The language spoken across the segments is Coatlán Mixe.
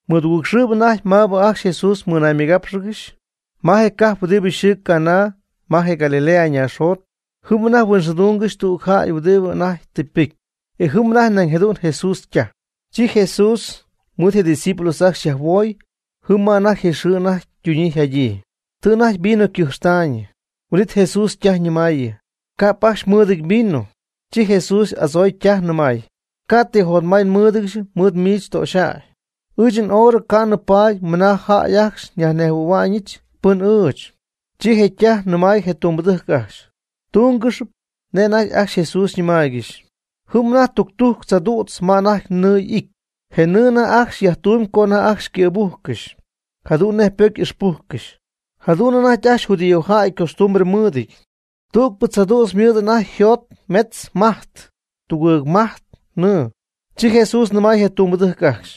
Mɨdugɨɨgxɨɨbɨ anajty maabɨ ajcxy Jesús mɨnaymɨgápxɨgɨxy, ma je cajp huɨdibɨ yxɨɨ Caná ma je Galilea naaxjot jɨm anajty huinxɨɨdungɨxy tüg jäy huɨdibɨ anajty tɨ ypɨcy. E jɨm anajty nañ jadu'n Jesús ytaj. Chi Jesús mɨɨd je' ydiscípulos ajcxy yajhuooy jɨm ma je xɨɨ anajty ytuñyii yjadyii. Tɨ anajty vino ycɨjxtaayñɨ̃, huin'it Jesús ytaj ñɨmayñɨ: ―Ca'p ajcxy mɨɨdɨñ vino. Chi Jesús y'adzooy ytaj nɨmay: ―Ca' ti jotmay nmɨɨdɨdyɨch mɨɨd miich töxyäy. Ɨɨch nhorɨ ca'nɨ paady mɨna jäy ajcxy nyajnejhuɨ̈huɨbɨch pɨn ɨɨch. Chi je ytaj nɨmay je tumbɨdɨjc ajcxy: ―Mdúngɨxɨpy nej anajty ajcxy Jesús xyñɨmaaygɨxy. Jɨm anajty tudujc tzaadu'tz ma anajty nɨɨ y'ity. Je nɨɨ anajty ajcxy yajtumyb co anajty ajcxy ycɨ̈bujcɨxy jadu'n nej ypocy ixpujcɨxy, jadu'n anajty ajcxy judíojäy costumbre mɨɨdɨty. Tügpɨ tzaadu'tz ymɨɨd anajty yjot metz majt tugɨɨg majt nɨɨ. Chi Jesús nɨmay je tumbɨdɨjc ajcxy: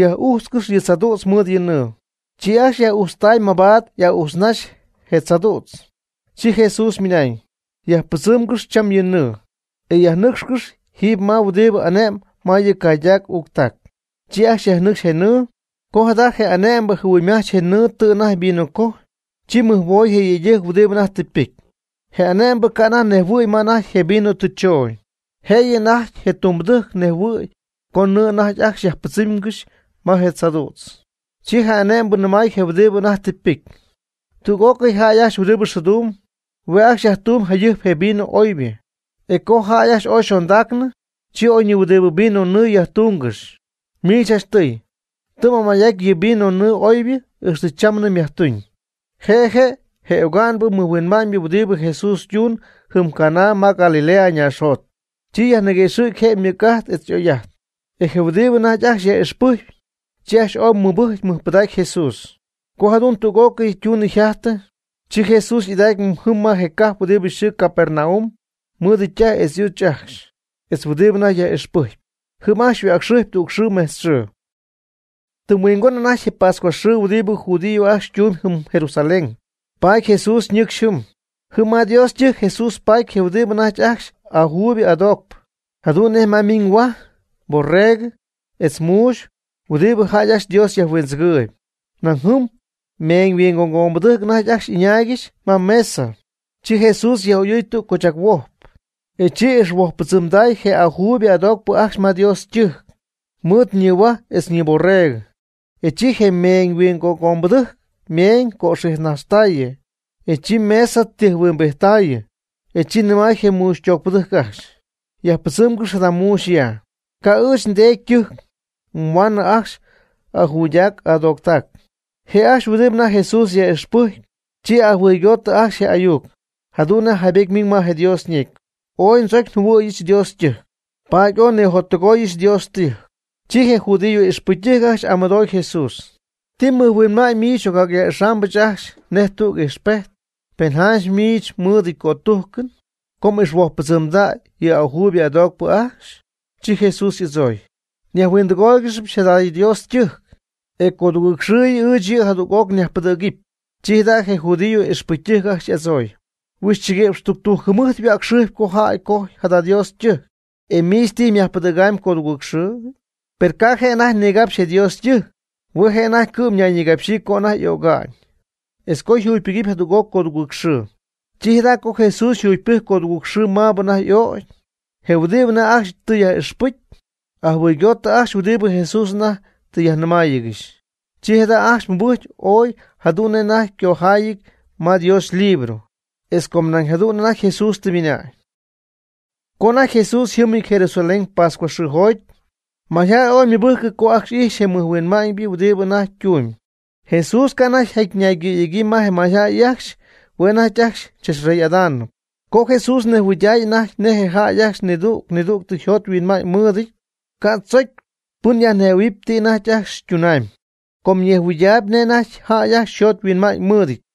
―Yaj'ujtzcɨx yɨ tzaadu'tz mɨɨd nɨɨ. E chi ajcxy yaj'ujtztay mabaat y'a'ujtznaxy je tzaadu'tz. Chi Jesús ymɨnañ: ―Yajpɨdzɨmgɨx cham yɨ nɨɨ, e yajnɨcxcɨx jiiby ma huɨdibɨ ane'mb ma yɨ caydac uuctac. Chi ajcxy yajnɨcxy je nɨɨ. Co jada' je ane'mbɨ jɨhuɨymajch je nɨɨ tɨ anajty yvinocojy, chi mɨjhuoy je yëydɨjc huɨdibɨ anajty tɨ ypɨcy. Je ane'mbɨ ca' anajty nejhuɨ̈y ma anajty je vino tɨ choñ. Jëyɨ anajty je ytumbɨdɨjc ñejhuɨɨyb co nɨɨ anajty ajcxy yajpɨdzɨmgɨxy ma je tzaadu'tz. Chi je ane'mbɨ nɨmay je huɨdibɨ anajty tɨ ypɨcy: ―Tüg'ócɨy jäy ajcxy huɨdibɨ xɨɨdumb, hue' ajcxy yajtumyb jayɨjp je vino oybɨ. E co jäy ajcxy ooy yxondaacnɨ, chi oyñihuɨdibɨ vino nɨɨ jacyajtungɨxy. Miich janchtɨy, tɨ m'amay'aty yɨ vinonɨɨ oybɨ ixtɨ chamnɨ myajtuñ. Je' je' je oga'nɨbɨ mɨjhuinma'ñ huɨdibɨ Jesús ytuun jɨm Caná ma Galilea ñaaxjot. Chi yajniguëxɨ̈gy je ymɨc'ajt etz y'oyjäy'ajt. E je huɨdibɨ anajty ajcxy yaj'ixpɨjcpy, chi ajcxy ooy mɨbɨjcy mɨjpɨdacy je Jesús. Co jadu'n tüg'ócɨy ytunɨ yjajtɨ, chi Jesús y'ɨdacy jɨm ma je cajp huɨdi yxɨɨ Capernaum mɨɨd ytaj etz y'uch ajcxy, etz huɨdibɨ anajty yaj'ixpɨjcpy. Jɨm ajcxy yhuäcxɨjpy tüg xɨɨ mejtz xɨɨ. Tɨm huingon anajty je pascua xɨɨ huɨdibɨ judío ajcxy ytumy jɨm Jerusalén, paady Jesús ñɨcxy jɨm. Jɨm ma Dios ytɨjc Jesús paty je' huɨdibɨ anajty ajcxy ajuuybɨ adoocpɨ, jadu'n nej ma ymiiñ huaj, borregɨ, etz muuxy (huɨdibɨ jäy ajcxy Dios yajhuindzɨgɨɨyb). Nañ jɨm meeñyhuingogombɨdɨjc anajty ajcxy y'ɨñaaygɨxy ma ymesa. Chi Jesús yaj'oyɨɨy tüg cochac huojp. E chi ixhuojppɨdzɨmday je ajuuybɨ adoocpɨ ajcxy ma Dios ytɨjc ñihuaj etz ñiborrego. Chi yɨ meeñyhuingogombɨdɨjc ymeeñ cöxijtnajxtayɨ, e chi ymesa tijhuimbijttaayɨ. Chi nɨmay je muuxytoocpɨdɨjc ajcxy: ―Yajpɨdzɨmgɨx jada muuxy ya. Ca' ɨɨch nDeedy ytɨjc yhuaanɨ ajcxy ajuydac adooctac. Je' ajcxy huɨdibɨ anajty Jesús yaj'ixpɨjcpy chi ajɨhuɨygootɨ ajcxy je ayuc, jadu'n nej jaybety ymiñ ma Dios ñecy: “Ooy ndzocy njɨhuɨ̈yɨch Dios ytɨjc, paady ooy nnijottɨgoyɨch Dios ytɨjc.” Chi je judío ixpɨcytɨjc ajcxy y'amɨdooy Jesús: ―¿Ti mɨjhuinma'ñ miich xy'ocyaj'ixambɨch ajcxy nej tüg ijxpejt, pen janch mɨɨdɨty cötujcɨn co m'ixhuojppɨdzɨmdäy yɨ ajuuybɨ adoocpɨ ajcxy? Chi Jesús y'adzooy: ―Yajhuindɨgooygɨx jada Dios ytɨjc, e codugɨɨg xɨɨ ɨɨch yɨ' jadüg'oc nyajpɨdɨ̈gɨpy. Chi jada' je judío ixpɨcytɨjc ajcxy y'adzooy: ―Huixchɨguïpx tudujc jɨmɨjt yhuäcxɨjpy co jäy cojy jada Dios ytɨjc. ¿E miich tijy myajpɨdɨ̈gamy codugɨɨgxɨɨjɨ? Per ca' je' anajty nigapxy je Dios ytɨjc. Hue' je' anajty cɨ'm ñayñigapxyii co anajty y'öga'ñ, etz co yjugypɨgɨpy jadüg'oc codugɨɨg xɨɨ. Chi jada' co Jesús yjugypɨjcy codugɨɨg xɨɨ maabɨ anajty y'ögy, je huɨdibɨ anajty ajcxy tɨ yaj'ixpɨcy, ajɨhuɨygootɨ ajcxy huɨdibɨ Jesús anajty tɨ yajnɨmäyiigɨxy. Chi jada' ajcxy mɨbɨjcy ooy jadu'n nej anajty ycojaayɨty ma Dios ylibro, etz com nañ jadu'n anajty Jesús tɨ ymɨna'ñ. Co anajty Jesús yjɨmɨty Jerusalén pascua xɨɨjoty, mayjäy ooy ymɨbɨjcɨ co ajcxy ijxy je mɨjhuinma'ñ huɨdibɨ anajty ytumyb. Jesús ca' anajty yjaty ñaygɨ̈yegyii ma je mayjäy ajcxy (hue' anajty ajcxy chachyajrey'adamy). Com Jesús ñejhuɨydaayb anajty nej jäy ajcxy nidüg nidüg yjot yhuinma'ñ mɨɨdɨty ca' tzocy pɨn yajnɨmähuɨɨyb ti anajty ajcxy ytunamy, com ñejhuɨydaayb nej jäy ajcxy yjot yhuinma'ñ mɨɨdɨty.